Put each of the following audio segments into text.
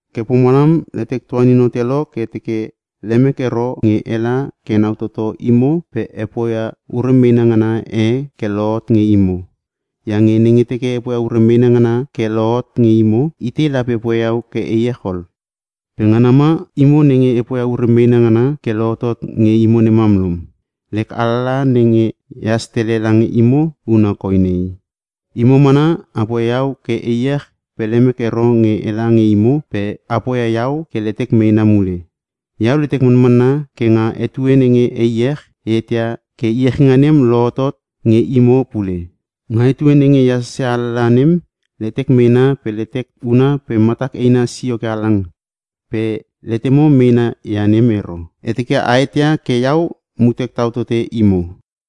Ke pomalam letek tuanin hote lo ke e teke lemek ero nge ela ke enau toto imo pe e poia ure meena ngana e ke lohot nge imo. Iange nenge teke e poia ure meena ngana ke lohot nge imo, itei lape poia iau ke e iech ol? Pe ngana ma imo nenge e poia ure meena ngana ke lohotot nge imo nem mam lom. Lek alalaha nenge ehas tele lange imo huna koi nei. Imo mana a poia iau ke e iech pe lemek ero nge ela nge imo pe a poia iau ke letek meena mule. Iau letek manmanna ke nga etue nenge e iech, e eteia ke iechinga nem lohotot nge imo pule. Nga etue nenge e hasasia alalaha nem letek meena pe letek una pe matak eina sio ke halang, pe letemo meena ia nem ero. E teke a eteia ke iau mutek tau tote imo.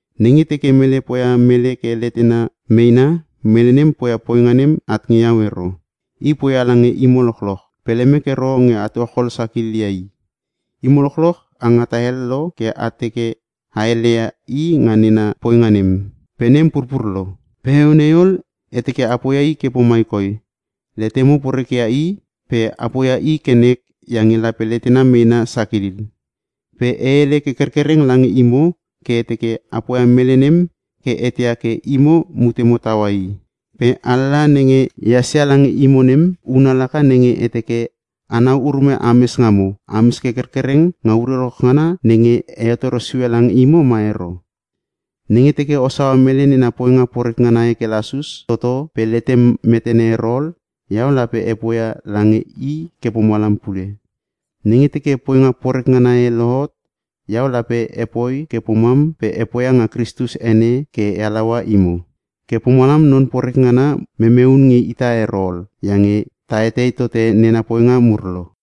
Nenge teke mele poia mele ke letena meena, mele nem poia poinga nem at nge iau ero. I poia lange imo lochloch. Pe lemek ero nge a tuachol sakililia i. Imo lochloch a ngata hel lo ke a teke a heleia i nga nena poinga nem, ke nem purpur lo. Pe heueu nei ol, e teke a poia i ke pomai koi: Letemo poreke ia i pe a poia i ke nek iange lape letena meena sakilil. Pe e hele ke kerkereng lange imo ke e teke a poia mele nem ke eteia ke imo mutemo taua i. Pe alalaha nenge ehas ia lange imo nem, huna laka nenge e teke enau urume ames ngamo, ames ke kerkereng nga ure lochloch ngana nenge e hetoro sue lange imo ma ero. Nenge teke o saua mele nena poinga poreke ngana ke lasus toto pe letem metene ero ol, iau lape e poia lange i ke pomalam pule. Nenge teke poinga poreke ngana e lohot, iau lape epoi ke pomam pe e poia nga Kristus ene ke e halaua imo. Ke pomalam non poreke ngana memeun nge ita ero ol, iange ta etei tote nena poinga mur lo.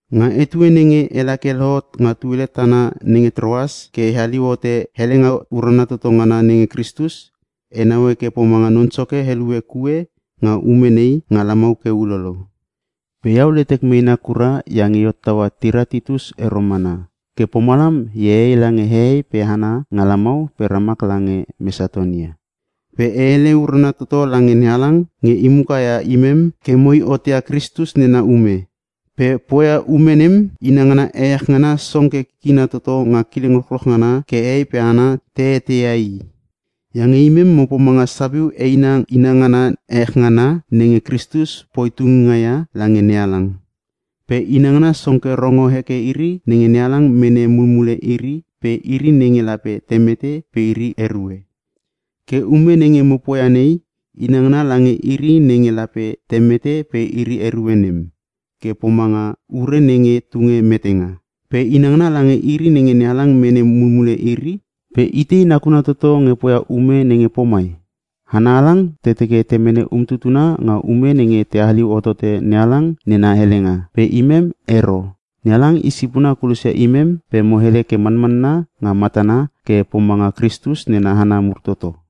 Nga etue nenge ela ke e lohot nga tuele tana nenge Troas ke e haliu hote helenga urana toto ngana nenge Kristus, e naue ke pomanga Non Soke helue kue nga ume nei nga lamau ke ulolo. Pe iau letek meena kura iange e hottaua tira Titus ero mana. Ke pomalam e ee lange hehei pe hana nga lamau pe ramak lange Mesatonia. Pe e hele urana toto lange NeHalang nge i muka ia imem ke moi hotia Kristus nena ume. Pe poia ume nem inangana ehech ngana song ke kikina toto nga kileng lochloch ngana ke hehei pe hana te eteia i. Iange imem mo pomanga sapiu eina inangana ehech ngana nenge Kristus poi tunginga ia lange NeHalang. Pe inangana song ke rongo heke iri nenge NeHalang mene mulmule iri pe iri nenge lape te mete pe iri erue. Ke ume nenge mo poia nei, inangana lange iri nenge lape te mete pe iri erue nem, ke pomanga ure nenge tunge metenga. Pe inangana lange iri nenge NeHalang mene mulmule iri, ke pomanga ure nenge tunge maulinga. Pe itei nakuna toto nge poia ume nenge pomai? Hana halang te teke te mene umtutuna nga ume nenge te haliu hotote NeHalang nena helenga, pe imem ero. NeHalang i sipona kulosia imem pe mo hele ke manmanna nga matana ke pomanga Kristus nena hana mur toto.